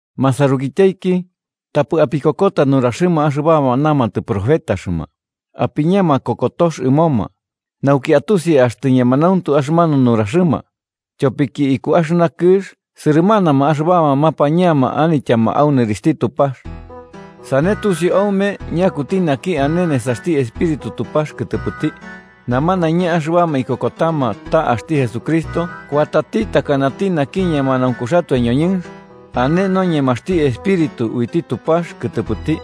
Masarukityaiki, tapɨ apikokota nuraxɨma axɨbama namatɨ profetaxɨma, apiña makokotox ɨmoma, nauki atusi axtɨ ñemanauntu axɨmanu nuraxɨma. Tyopiki iku axɨna kɨx sɨrɨmanama axɨbama mapañama anityama au nɨrixhti Tupax. Sane tusiu aume ñakuti naki ane nesaxti Espíritu Tupax kɨtɨpɨti: namanaiña axɨbama ikokotama ta axti Jesucristo kuatati takanati naki ñemanaunkuxatoe ñoñɨnx, ane noñemaxti Espíritu uiti Tupax kɨtɨpɨti.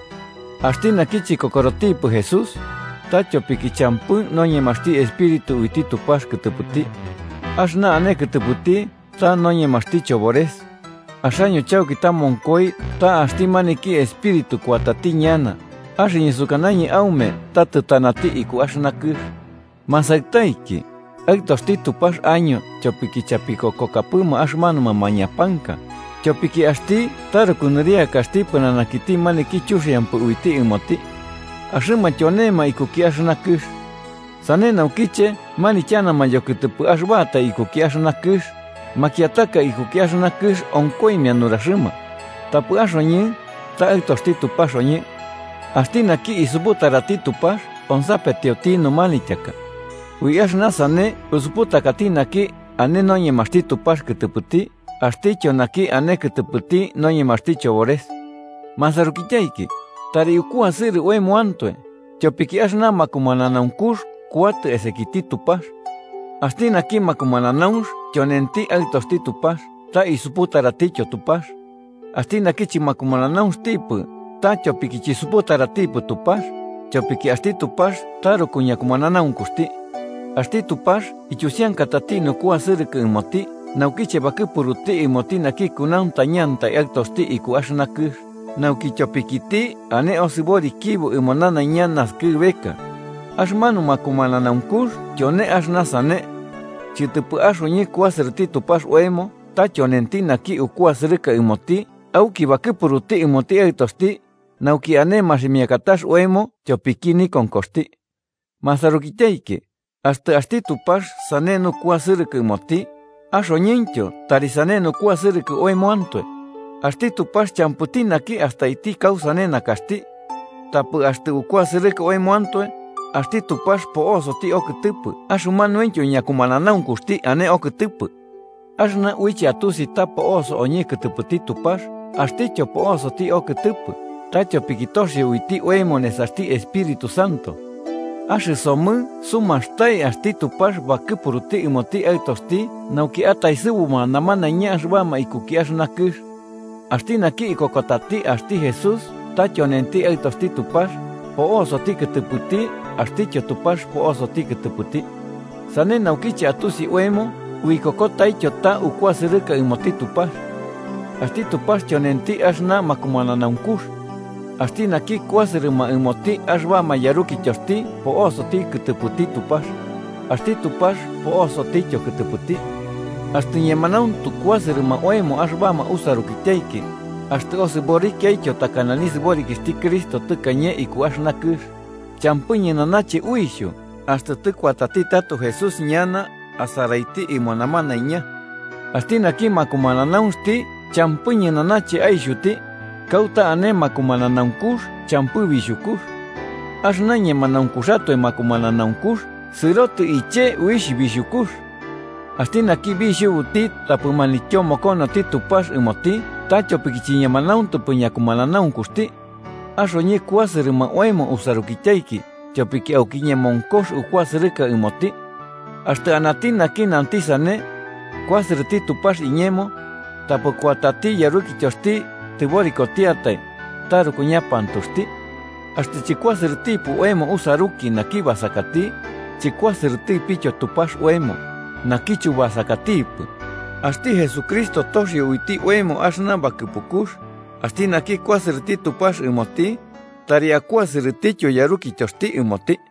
Axti naki chikokorotipɨ Jesús, ta tyopiki champɨ noñemaxti Espíritu uiti Tupax kɨtɨpɨti. Axɨna ane kɨtɨpɨti ta noñemaxti chobores. Axaño chauki tamonkoi ta axti maniki espíritu kuatati ñana, axɨñɨ sukanañɨ aume ta tɨtanati iku axɨna kɨx. Masaɨtaiki, aɨtoxti Tupax año tyopiki chapikokokapɨma axɨmanuma mañapanka, tyopiki axti taruku nɨriakaxti pɨnanakiti maniki chuxiampɨ uiti ɨmoti. Axɨma tyonema ikuki axɨna kɨx. Sane naukiche manityanama yokɨtɨpɨ axɨbatai ikuki axɨna kɨx, makiataka ikuki axɨna kɨx onkoimia nuraxɨma. Tapɨ axoñɨ, ta aɨtoxti Tupax oñɨ. Axti naki isuputarati Tupax onsapetioti numanityaka. Ui axɨna sane usuputakati naki ane noñemaxti Tupax Kɨtɨpɨti axtityo naki ane kɨtɨpɨti noñemaxti chobores. Masarukityaiki, tari ukuasɨrɨ oemoantoe, tyopiki axɨna makumananaunkux kuatɨ esakiti Tupax. Axti naki makumananaunx tyonenti aɨtoxti Tupax ta isuputaratityo Tupax. Axti naki chɨmakumananautipɨ ta tyopiki chisuputaratipɨ Tupax, tyopiki axti Tupax taruku ñakumananaunkuxti. Axti Tupax ityusiankatati nukuasɨrɨkɨ ɨmoti naukiche bakɨpuruti ɨmoti naki kunauntañati Aɨtoxti iku axɨna kɨx, nauki tyopikiti ane osɨborikibo ɨmo nanaiña naskɨbeka. Axɨmanu makumananaunkux tyone axɨna sane: chɨtɨpɨ axoñɨ kuasɨrɨti Tupax oemo, ta tyonenti naki ukuasɨrɨka ɨmoti auki bakɨpuruti ɨmoti Aɨtoxti, nauki ane maximiakatax oemo tyopiki nikonkoxti. Masarukityaiki, axtɨ axti Tupax sane nukuasɨrɨkɨ ɨmoti, axoñɨntyo tari sane nukuasɨrɨkɨ oemoantoe. Axti Tupax champɨti naki astaiti kausane nakaxti. Tapɨ axtɨ ukuasɨrɨka oemoantoe, axti Tupax po'osoti okɨtɨpɨ axɨmanuintyo ñakumananaunkuxti ane okɨtɨpɨ. Axɨna uiche atusi ta po'oso oñɨ kɨtɨpɨti Tupax axtityo po'osoti okɨtɨpɨ, ta tyopiki toxio uiti oemo nesaxti Espíritu Santo. Axɨsomɨ sumastai axti Tupax bakɨpuruti ɨmoti Aɨtoxti nauki ataesɨbuma namanaiña axɨbama ikuki axɨna kɨx. Axti naki ikokotati axti Jesús ta tyonenti Aɨtoxti Tupax, po'osoti kɨtɨpɨti axtityo Tupax po'osoti kɨtɨpɨti. Sane naukiche atusi oemo uikokotaityo ta ukuasɨrɨka ɨmoti Tupax. Axti Tupax tyonenti axɨna makumananaunkux, axti naki kuasɨrɨma ɨmoti axɨbama yarukityoxti po'osoti kɨtɨpɨti Tupax, axti Tupax po'osotityo kɨtɨpɨti. Axtɨ ñemanauntu kuasɨrɨma oemo axɨbama usarukityaiki, axtɨ osɨborikiaityo takana nisɨborikixhti Cristo tɨkañe iku axɨna kɨx, champɨ ñɨnanache uixhu axtɨ tɨkuatati tato Jesús ñana asaraiti ɨmo namanaiña. Axti naki makumananaunxti champɨ ñɨnanache aixhuti. Kauta ane makumananaunkux champɨ bixhukux. Axɨna ñemanaunkuxatoe makumananaunkux sɨrotɨ iche uixh bixhukux. Axti naki bixhubuti tapɨ manityomokonoti Tupax ɨmoti ta tyopiki chiñemanauntupɨ ñakumananaunkuxti. Axoñɨ kuasɨrɨma oemo usarukityaiki tyopiki auki ñemonkox ukuasɨrɨka ɨmoti. Axtɨ anati naki nanti sane: “Kuasɨrɨti Tupax iñemo”, tapɨ kuatati yarukityoxti tɨborikotiatai, taruku ñapantuxti. Axtɨ chɨkuasɨrɨtipɨ oemo usaruki, naki basakati, chɨkuasɨrɨtipityo Tupax oemo, naki chubasakatipɨ. Axti Jesucristo toxio uiti oemo axɨna bakɨpukux: axti naki kuasɨrɨti Tupax ɨmoti, tari akuasɨrɨtityo yarukityoxti ɨmoti.